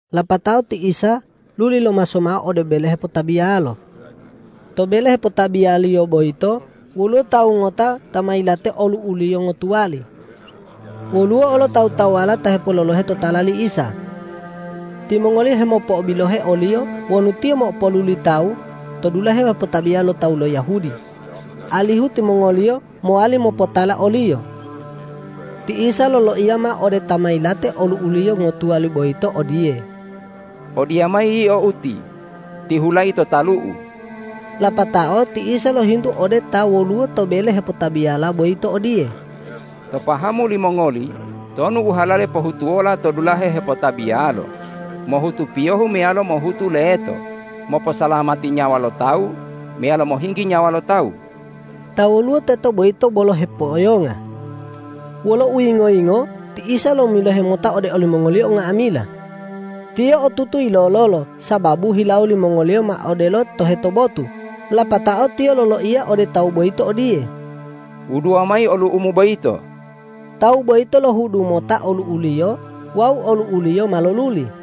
Lapatao ti Isa luli lomaso mao ode bele hepotabiyalo. To bele hepotabiyaliyo boyito woluwo tawu ngota ta ma yilate olu'uliyo ngotuwali. Woluwo olo tawu-tawuwala ta hepololohe totala li Isa. Timongoliyo hemopo'obilohe o-Liyo wonu Tiyo mopo'oluli tawu to dulahe hepotabiya lo tawu lo Yahudi, alihu timongoliyo mowali mopotala o-Liyo. Ti Isa loloiya mao ode ta ma yilate olu'uliyo ngotuwali boyito odiye,”Odiyamayi yio uti, tihulayi to talu-U.” Lapatao ti Isa lohintu ode ta woluwo to bele hepotabiyala boyito odiye,”To pahamu limongoli tonu u halale pohutuwola to dulahe hepotabiyalo, mohutu piyohu meyalo mohutu leto, moposalamati nyawa lo tawu meyalo mohinggi nyawa lo tawu?” Ta woluwo teto boyito bolo hipo'oyonga. Wolo uyingo-yingo ti Isa lomilohe mota ode olimongoliyo nga'amila. Tiyo otutu yilololo sababu hilawo limongoliyo ma odelo toheto botu. Lapatao Tiyo loloiya ode tawu boyito odiye,”Wuduwa mayi olu'umu boyito!” Tawu boyito lohudu mota olu'uliyo wawu olu'uliyo ma loluli.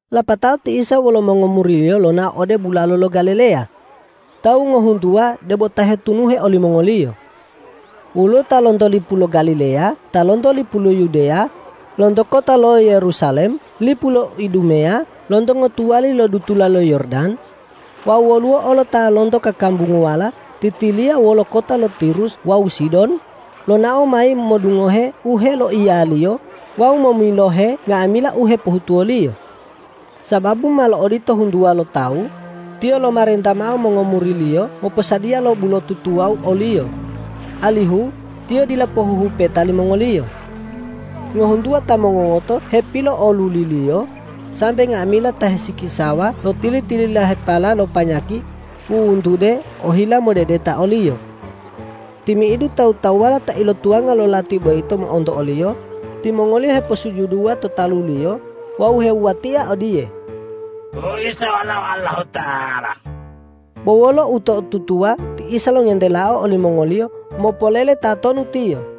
Lapatao ti Isa wolo mongomuri-Liyo lonao ode bulalo lo Galileya. Tawu ngohuntuwa debo ta hetunuhe olimongoliyo. Woluwo ta lonto lipu lo Galileya, ta lonto lipu lo Yudeya, lonto kota lo Yerusalem, lipu lo Idumeya, lonto ngotuwali lo dutula lo Yordan, wawu woluwo olo ta lonto kakambunguwala titiliya wolo kota lo Tirus wawu Sidon, lonao mayi modungohe u heloiya-Liyo wawu momilohe nga'amila u hepohutuwo-Liyo. Sababu malo odito huntuwa lo tawu, Tiyo lomarenta mao mongomuri-Liyo moposadiya lo bulotu tuwawu o-Liyo, alihu Tiyo dila pohuhupeta limongoliyo. Ngohuntuwa ta mongongoto hepilo'oluli-Liyo, sambe nga'amila ta hisikisawa lo tili-tililahepala lo panyaki wuwuntude ohila modedeta o-Liyo. Timi'idu tawu-tawuwala ta ilotuwanga lo lati boyito mo'onto o-Liyo, timongoliyo heposujuduwa to talu-Liyo wawu hewuwatia odiye,”Wu Isa Walao Allahuta'ala.” Bo wolo uto'otutuwa ti Isa longentelao olimongoliyo mopolele tatonu Tiyo.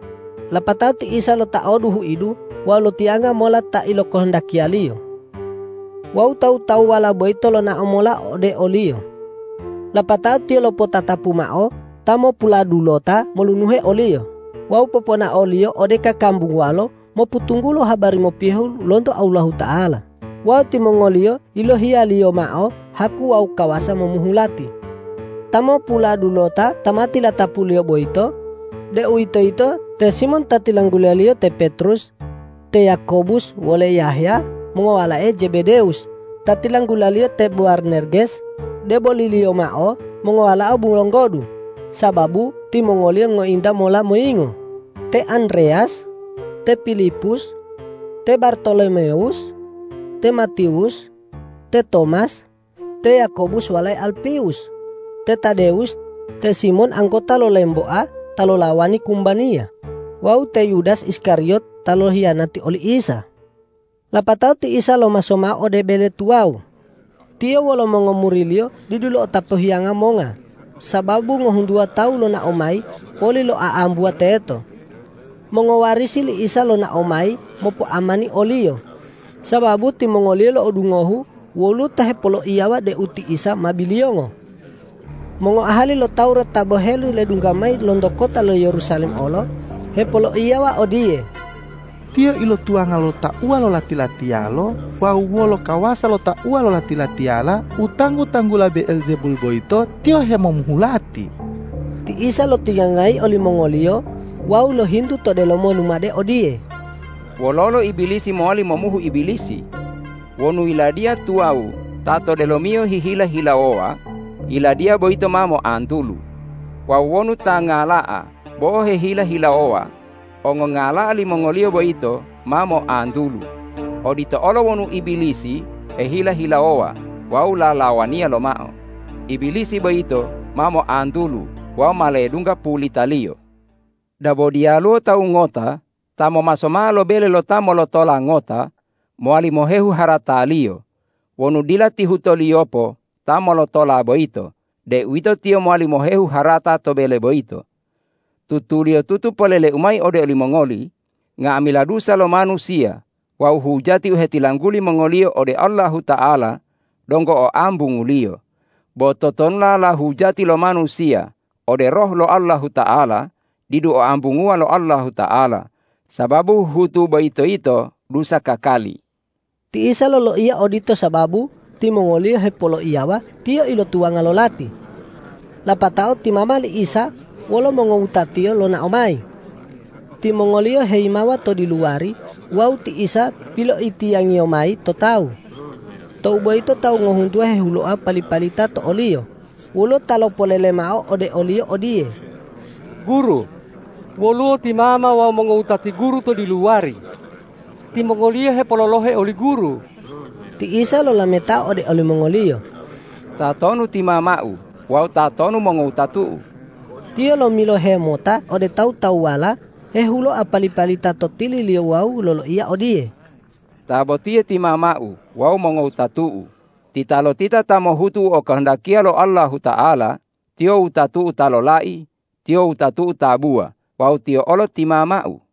Lapatao ti Isa lotaodu huidu wawu lotiyanga mola ta ilokohondakiya-Liyo. Wawu tawu-tawuwala boyito lonao mola ode o-Liyo. Lapatao Tiyo lopotatapu mao ta mopuladulota molunuhe o-Liyo wawu poponao-Liyo ode kakambunguwalo mopotunggulo habari mopiyohu lonto Allahuta'ala wawu timongoliyo yilohiya-Liyo mao haku wawu kawasa momuhu lati. Ta mopuladulota ta ma tilatapu-Liyo boyito, deuwitoyito te Simon ta tilanggula-Liyo te Petrus, te Yakobus wole Yahya mongowalae Jebedewus ta tilanggula-Liyo te Bowarnerges, deboliliyo mao mongowalao bulonggodu sababu timongoliyo ngointa mola moyingo, te Andreyas, te Pilipus, te Bartolomewus, te Matiwus, te Tomas, te Yakobus walae Alpewus, te Tadewus, te Simon anggota lo lemboa ta lolawani kumbaniya wawu te Yudas Iskariyot ta lohiyanati oli Isa. Lapatao ti Isa lomaso mao ode bele tuwawu. Tiyo wolo mongomuri-Liyo didu lo'otapu hiyanga monga, sababu ngohuntuwa tawu lonao mayi poli loa'ambuwa teto. Mongowarisi li Isa lonao mayi mopoamani o-Liyo, sababu timongoliyo lo'odungohu woluwo ta hepoloiyawa deu ti Isa ma biliyongo. Mongoahali lo Tawurat ta boheli ledungga mayi lonto kota lo Yerusalem olo hepoloiyawa odiye,”Tiyo ilotuwanga lo tauwa lo lati-latiyalo wawu wolo kawasa lo tauwa lo lati-latiyala u tanggu-tanggula Be'eljebul boyito, Tiyo hemomuhu lati.” Ti Isa lotiyangayi olimongoliyo wawu lohintu to delomo lumade odiye,”Wololo Ibilisi mowali momuhu Ibilisi? Wonu yiladiya tuwawu ta to delomiyo hehila-hilawowa, yiladiya boyito ma moantulu. Wawu wonu ta ngala'a bo hehila-hilawowa, ongongala'a limongoliyo boyito ma moantulu. Odito olo wonu Ibilisi hehila-hilawowa wawu lalawaniya lomao, Ibilisi boyito ma moantulu wawu ma ledungga pulitaliyo. Dabo diyaluwo tawu ngota ta momaso mao lo bele lo ta molotola ngota mowali mohehu harataliyo wonu dila tihutoliyopo ta molotola boyito, deuwito tiyo mowali mohehu harata to bele boyito. Tutuliyotutu polele-U mayi ode olimongoli: Nga'amila dusa lo manusiya wawu hujati u hetilangguli mongoliyo ode Allahuta'ala donggo oambunguliyo. Bo totonulala hujati lo manusiya ode Roh lo Allahuta'ala didu oambunguwa lo Allahuta'ala, sababu huhutu boyito yito dusa kakali.” Ti Isa loloiya odito sababu timongoliyo hipoloiyawa Tiyo ilotuwanga lo lati. Lapatao ti mama li Isa wolo mongowuta-Tiyo lonao mayi. Timongoliyo heyimawa to diluwari wawu ti Isa piloitiyangiyo mayi to tawu. Tou boyito tawu ngohuntuwa hehuloa pali-palita to o-Liyo. Woluwo ta lopolele mao ode o-Liyo odiye,”Guru, woluwo ti mama wawu mongowutati Guru to diluwari. Timongoliyo hepololohe oli Guru.” Ti Isa lolametao ode olimongoliyo,”Tatonu ti mama-U wawu tatonu mongowutatu-U?” Tiyo lomilohe mota ode tawu-tawuwala hehuloa pali-palita to tili-Liyo wawu loloiya odiye,”Ta botiye ti mama-U wawu mongowutatu-U! Titalotita ta mohutu u okohondakiya lo Allahuta'ala, tiyo wutatu-U ta lolai, tiyo wutatu-U tabuwa wawu tiyo olo ti mama-U.”